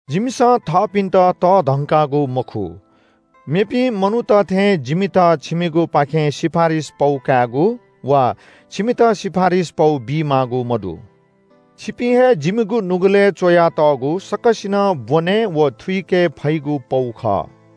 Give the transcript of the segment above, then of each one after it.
जिमिसं थःपिन्‍त तःधंकागु मखु। मेपिं मनूत थें जिमित छिमिगुपाखें सिफारिस पौ कायेगु वा छिमित सिफारिस पौ बीमाःगु मदु। छिपिं हे जिमिगु नुगलय् च्‍वयातःगु सकसिनं ब्‍वने व थुइके फइगु पौ खः।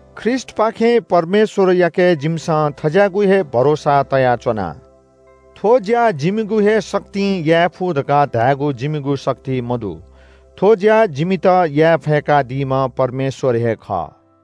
ख्रीष्‍टपाखें परमेश्‍वरयाके जिमिसं थज्‍याःगु हे भरोसा तयाच्‍वना। थ्‍व ज्‍या जिमिगु हे शक्तिं याये फु धकाः धायेगु जिमिगु शक्ति मदु। थ्‍व ज्‍या जिमित याये फय्‌कादीम्‍ह परमेश्‍वर हे खः।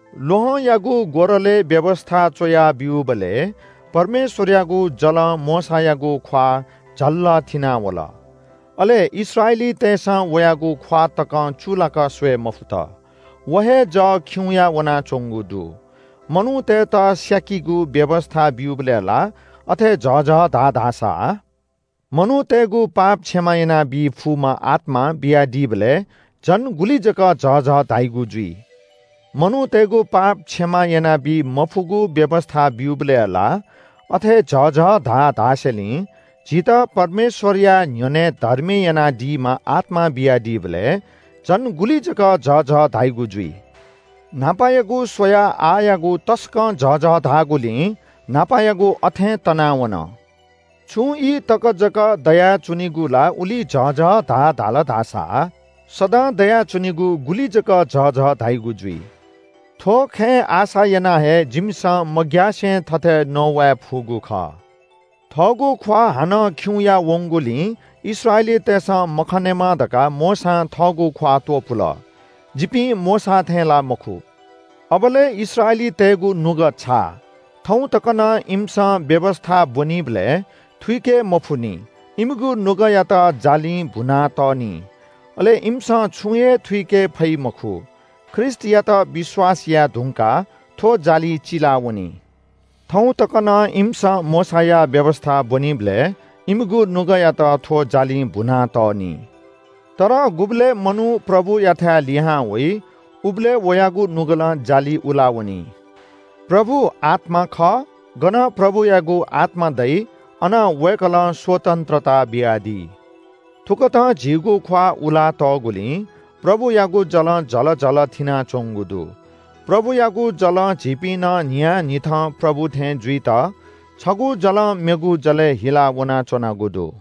ल्‍वहंयागु ग्‍वरलय् व्‍यवस्‍था च्‍वयाः ब्‍यूबलय् परमेश्‍वरयागु जलं मोशायागु ख्‍वाः झल्‍ल थिनावल। अले इस्राएलीतय्‌सं वयागु ख्‍वाः तकं चूलाक स्‍वये मफुत। व हे जः खिउँया वनाच्‍वंगु दु। मनूतय्‌त स्‍याकीगु व्‍यवस्‍था ब्‍यूबलय् ला अथे झःझः धाः धाःसा मनूतय्‌गु पाप क्षमा यानाबी फुम्‍ह आत्‍मा बियादीबलय् झन गुलि जक झःझः धाइगु जुइ? मनूतय्‌गु पाप क्षमा यानाबी मफुगु व्‍यवस्‍था ब्‍यूबलय् ला अथे झःझः धाः धासेंलि झीत परमेश्‍वरया न्‍ह्यःने धर्मी यानादीम्‍ह आत्‍मा बियादीबलय् झन गुलि जक झःझः धाइगु जुइ। न्‍हापायागु स्‍वयाः आःयागु तसकं झःझः धाःगुलिं न्‍हापायागु अथें तनावन। छुं ई तक जक दयाच्‍वनीगु ला उलि झःझः धाः धाल धाःसा सदां दयाच्‍वनीगु गुलि जक झःझः धाइगु जुइ? थ्‍व खँय् आशा यानाः हे जिमिसं मग्‍यासे थथे नवाये फुगु खः। थःगु ख्‍वाः हानं खिउँया वंगुलिं इस्राएलीतय्‌सं मखनेमा धकाः मोशां थःगु ख्‍वाः त्‍वपुल। जिपिं मोशा थें ला मखु। अबलय् इस्राएलीतय्‌गु नुगः छाः। थौं तक नं इमिसं व्‍यवस्‍था ब्‍वनीबलय् थुइके मफुनि, इमिगु नुगःयात जालिं भुनातः नि। अले इमिसं छुं हे थुइके फइ मखु। ख्रीष्‍टयात विश्‍वास याये धुंकाः थ्‍व जालि चिलावनी। थौं तक नं इमिसं मोशाया व्‍यवस्‍था ब्‍वनीबलय् इमिगु नुगःयात थ्‍व जालिं भुनातः नि। तर गुबलय् मनू प्रभुयाथाय् लिहां वइ उबलय् वयागु नुगलं जालि उला वनी। प्रभु आत्‍मा खः। गन प्रभुयागु आत्‍मा दइ अन वय्‌कलं स्‍वतन्‍त्रता बियादी। थुकथं झीगु ख्‍वाः उलातःगुलिं प्रभुयागु जलं झल झल थिनाच्‍वंगु दु। प्रभुयागु जलं झीपिं नं न्‍हियान्‍हिथं प्रभु थें जुइत छगू जलं मेगु जलय् हिला वनाच्‍वनागु दु।